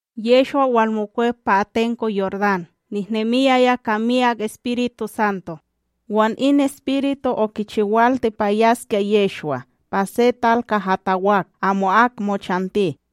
Yehshwa, walmokwep pa atenko Yordán nehnemiyaya ka miyak EspirituSanto, wan in Espiritu okichiwalti pa yaskya Yehshwa pa se tal kaha tawak amo'ak mochanti.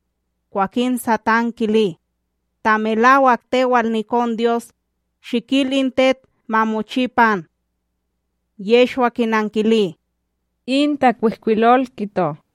Kwakin Satán kili: ―Ta melawak tewal nikonDyos, shikil in tet ma mochi pan. Yehshwa kinankili: ―In takwihkwilol kito: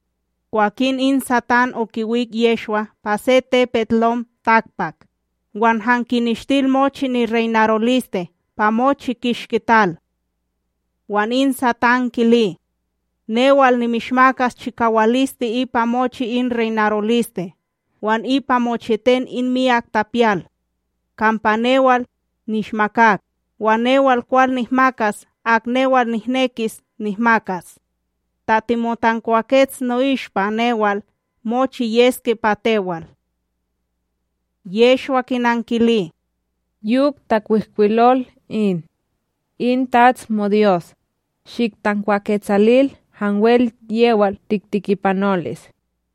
Kwakin in Satán okiwik Yehshwa pa se tepetLom takpak, wan han kineshtil mochi nireynaroliste pa mochi kishki tal. Wan in Satán kili: ―Newal nimishmakas chikawaliste ipa mochi in reynaroliste wan ipa mochiten in miyak tapiyal. Kampa newal nishmakak, wan newal kwal nihmakas ak newal nihnekis nihmakas. Ta timotankwakets no'ishpa newal, mochi yeske pa tewal. Yehshwa kinankili: ―Yok takwihkwilol in: “In TATS moDyos, shiktankwaketsalil hanwel yewal tiktikipanolis.”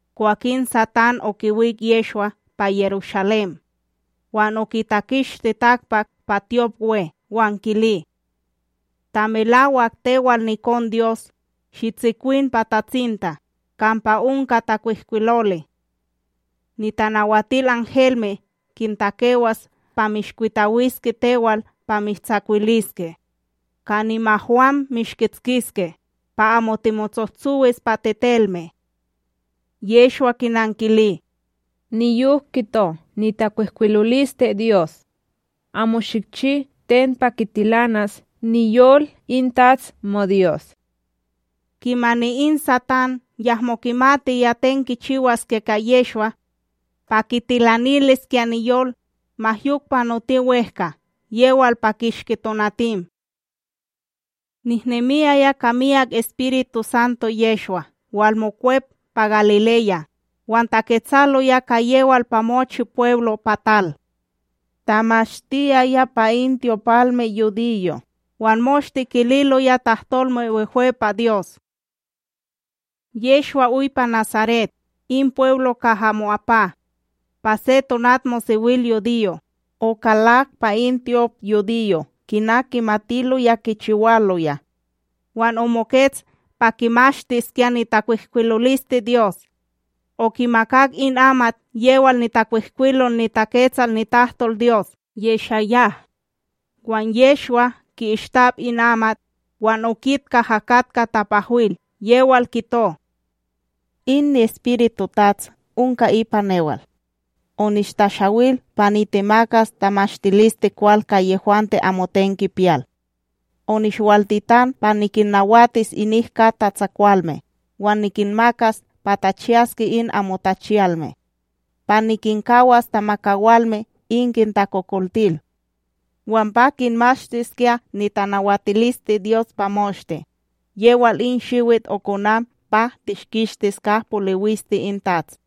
Kwakin Satán okiwik Yehshwa pa Yerushalém wan okitakishti takpak pa tyopWe wan kili: ―Ta melawak tewal nikonDyos, shitsikwin pa tatsinta; kampa onka takwihkwiloli: Nitanawatilhelme kintakewas pa mishkwitawiske tewal pa mishtsawiliske. Ka nimahwam mishkitskiske, pa amo timotsohtsowis pa tetelme. Yehshwa kinankili: ―Niyok kito nitakwihkwilolisteDyos: “Amo shikchi ten pa kitilanas niyol in TATS moDyos.” Kimani in Satán yahmo kimatiya ten kichiwaskya ka Yehshwa pa kitilaniliskya niyol, ma yok panoti wEhka yewal pa kishki tonatim. Nehnemiyaya ka miyak EspirituSanto Yehshwa walmokwep pa Galileya, wan taketsaloya ka yewal pa mochi pweblo pa tal. Tamashtiyaya pa in tyopalmeYudiyo', wan moshte kililoya tahtolme wehwe pa Dyos. Yehshwa oy pa Nasaret, in pweblo kaha mo'apa. Pa se tonatmosewilyudiyo okalak pa in tyopYudiyo, kina kimatiloya kichiwaloya, wan omokets pa kimashtiskya nitakwihkwilolisteDyos. Okimakak in amat yewal nitakwihkwilol niTaketsal nitahtolDyos YeshaYah; wan Yehshwa ki'istap in amat, wan okit kaha katka tapahwil yewal kito: In niEspiritu TATS onka ipa newal, onishtashawil pa nitemakas tamashtilisteKwal ka yehwante amoten kipiyal; onishwaltitan pa nikinnawatis inik kat tatsakwalme, wan nikinmakas pa tachiyaske in amo tachiyalme; pa nikinkawas tamakawalme in kintakokoltil; wan pa kinmashtiskya nitanawatilisteDyos pa moshte, yewal in shiwit okonan pa tishkishtis ka poliwiste in TATS.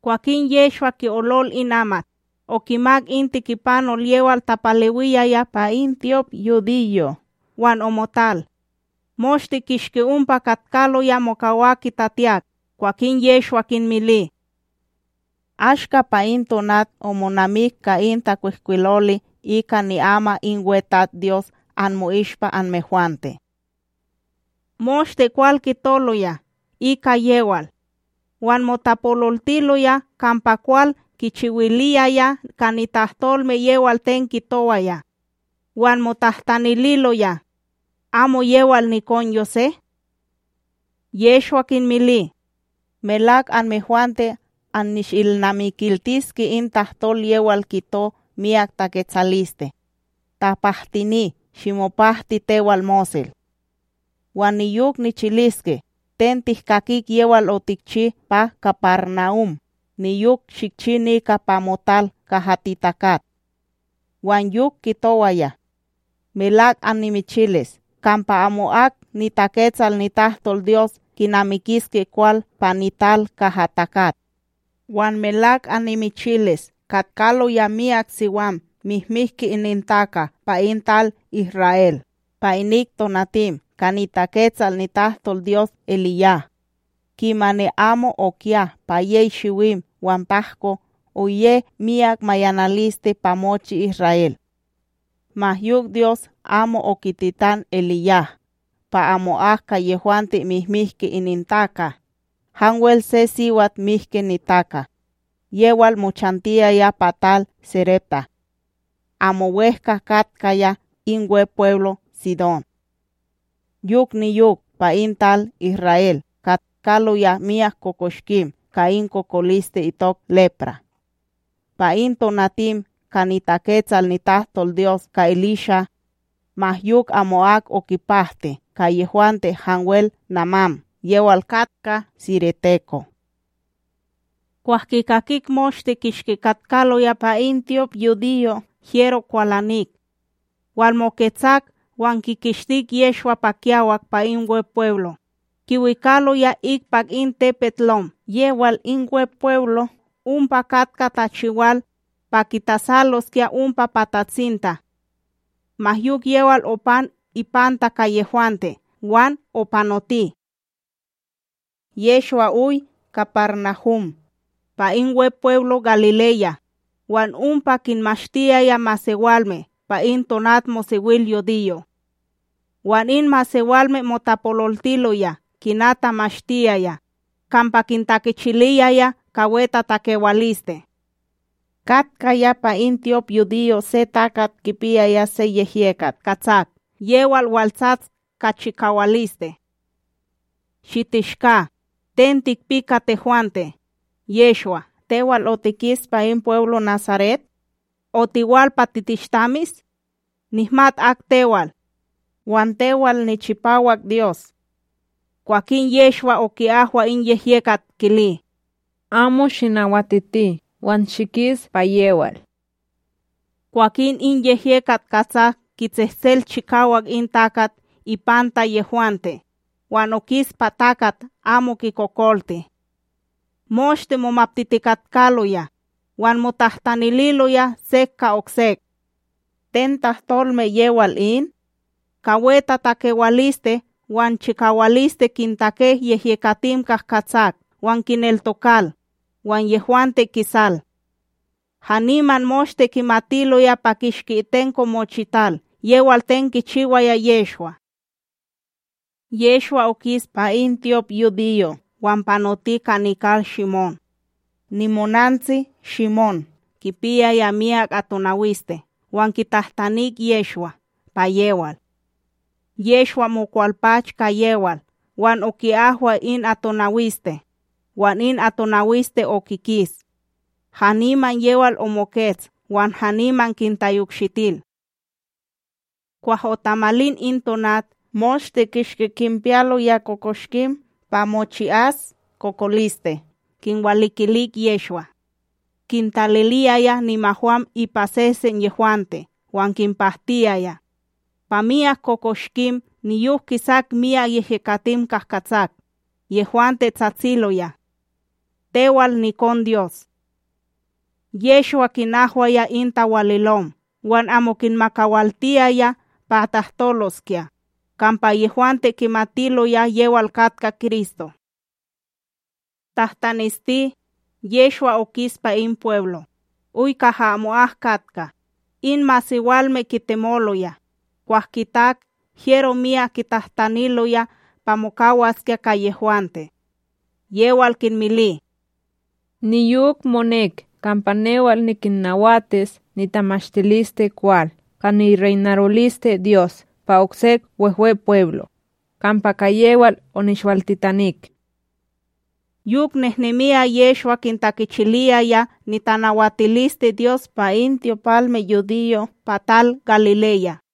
Kwakin Yehshwa ki'olol in amat, okimak in tikipanol yewal tapalewiyaya pa in tyopYudiyo wan omotal. Moshte kishki ompa katkaloya mokawak kitatiyak, kwakin Yehshwa kinmili: ―Ashka pa in tonat omonamik ka in takwihkwiloli ika ni'ama in WeTatsDyos anmo'ishpa anmehwante. Moshte kwal kitoloya ika yewal wan motapololtiloya kampa kwal kichiwiliyaya ka nitahtolme yewal ten kitowaya. Wan motahtanililoya: ―Amo yewal nikon Yosé? Yehshwa kinmili: ―Melak anmehwante annishilnamikiltiske in tahtol yewal kito miyak taketsaliste: “Tapahtini, shimopahti tewal mosel”; wan niyok nichiliske: “Ten tihkakik yewal otikchi pa KaparNahum, niyok shikchi nika pa motal kaha titakat.” Wan yok kitowaya: ―Melak annimichilis, kampa amo'ak niTaketsal nitahtolDyos kinamikiske kwal pa nital kaha takat. Wan melak annimichilis katkaloya myak siwam mihmihki inintaka pa in tal Isra'El pa inik tonatim ka niTaketsal nitahtolDyos EliYah, kimani amo okiya pa yey shiwim wan tahko, oye miyak mayanaliste pa mochi Isra'El; ma yok Dyos amo okititan EliYah pa amo'ak ka yehwante mihmihki inintaka, hanwel se siwat mihki nitaka, yewal mochantiyaya pa tal Sarepta, amo wEhka katkaya in Wepweblo Tsidón. Yok niyok, pa in tal Isra'El katkaloya myak kokoshkim ka in kokoliste itok lepra,b pa in tonatim ka niTaketsal nitahtolDyos ka Elisha, ma yok amo'ak okipahti ka yehwante hanwel Namán yewal katka sireteko. Kwah kikakik moshte kishki katkaloya pa in tyopYudiyo hyero kwalanik. Walmoketsak wan kikishtik Yehshwa pa kiyawak pa in Wepweblo, kiwikaloya ikpak in tepetLom yewal in Wepweblo ompa katka tachiwal, pa kitasaloskya ompa pa tatsinta. Ma yok yewal opan ipanta ka yehwante wan opanoti. Yehshwa oy KaparNahum, pa in Wepweblo Galileya, wan ompa kinmashtiyaya masewalme pa in tonatmosewilyudiyo. Wan in masewalme motapololtiloya kina tamashtiyaya, kampa kintakichiliyaya ka wetatakewaliste. Katkaya pa in tyopYudiyo se takat kipiyaya se yehyekat katsak yewal waltsats ka chikawaliste: ―Shitishka; ten tikpi ka tehwante, Yehshwa, tewal otikis pa in pweblo Nasaret? Otiwal pa titishtamis? Nihmat ak tewal, wan tewal NiChipawak Dyos. Kwakin Yehshwa oki'ahwa in yehyekat, kili: ―Amo shinawatiti, wan shikis pa yewal! Kwakin in yehyekat katsak kitsehtsel chikawak in takat ipanta yehwante, wan okis pa takat amo kikokolti. Moshte momaptitikatkaloya, wan motahtanililoya sek ka oksek: ―Ten tahtolme yewal in? Ka wetatakewaliste wan chikawaliste kintake yehyekatim kahkatsak wan kineltokal, wan yehwante kisal! Haniman moshte kimatiloya pa kishki itenko mochital yewal ten kichiwaya Yehshwa. Yehshwa okis pa in tyopYudiyo wan panoti ka nikal Shimón. Nimonantsi Shimóm kipiyaya miyak atonawiste wan kitahtanik Yehshwa pa yewal. Yehshwa mokwalpach ka yewal wan oki'ahwa in atonawiste, wan in atonawiste okikis. Haniman yewal omokets wan haniman kintayokshitil. Kwah otamalin in tonat, moshte kishki kinpiyaloya kokoshkim pa mochi'as kokoliste kinwalikilik Yehshwa; kintaliliyaya nimahwam ipa sesen yehwante wan kinpahtiyaya. Pa myak kokoshkim niyok kisak myak yehyekatim kahkatsak, yehwante tsatsiloya: ―Tewal nikonDyos. Yehshwa kinahwaya in tawalilom wan amo kinmakawaltiyaya pa tahtoloskya, kampa yehwante kimatiloya yewal katka Kristo. Tahtanesti, Yehshwa okis pa in pweblo, oy kaha amo'ak katka, in masewalme kitemoloya, kwah kitak hyero miyak kitahtaniloya pa mokawaskya ka yehwante, yewal kinmili: ―Niyok monek kampa newal nikinnawatis nitamashtilisteKwal ka nireynarolisteDyos pa oksek Wehwepweblo', kampa ka yewal onishwaltitanik. Yok nehnemiya Yehshwa kintakichiliyaya nitanawatilisteDyos pa in tyopalmeYudiyo' pa tal Galileya.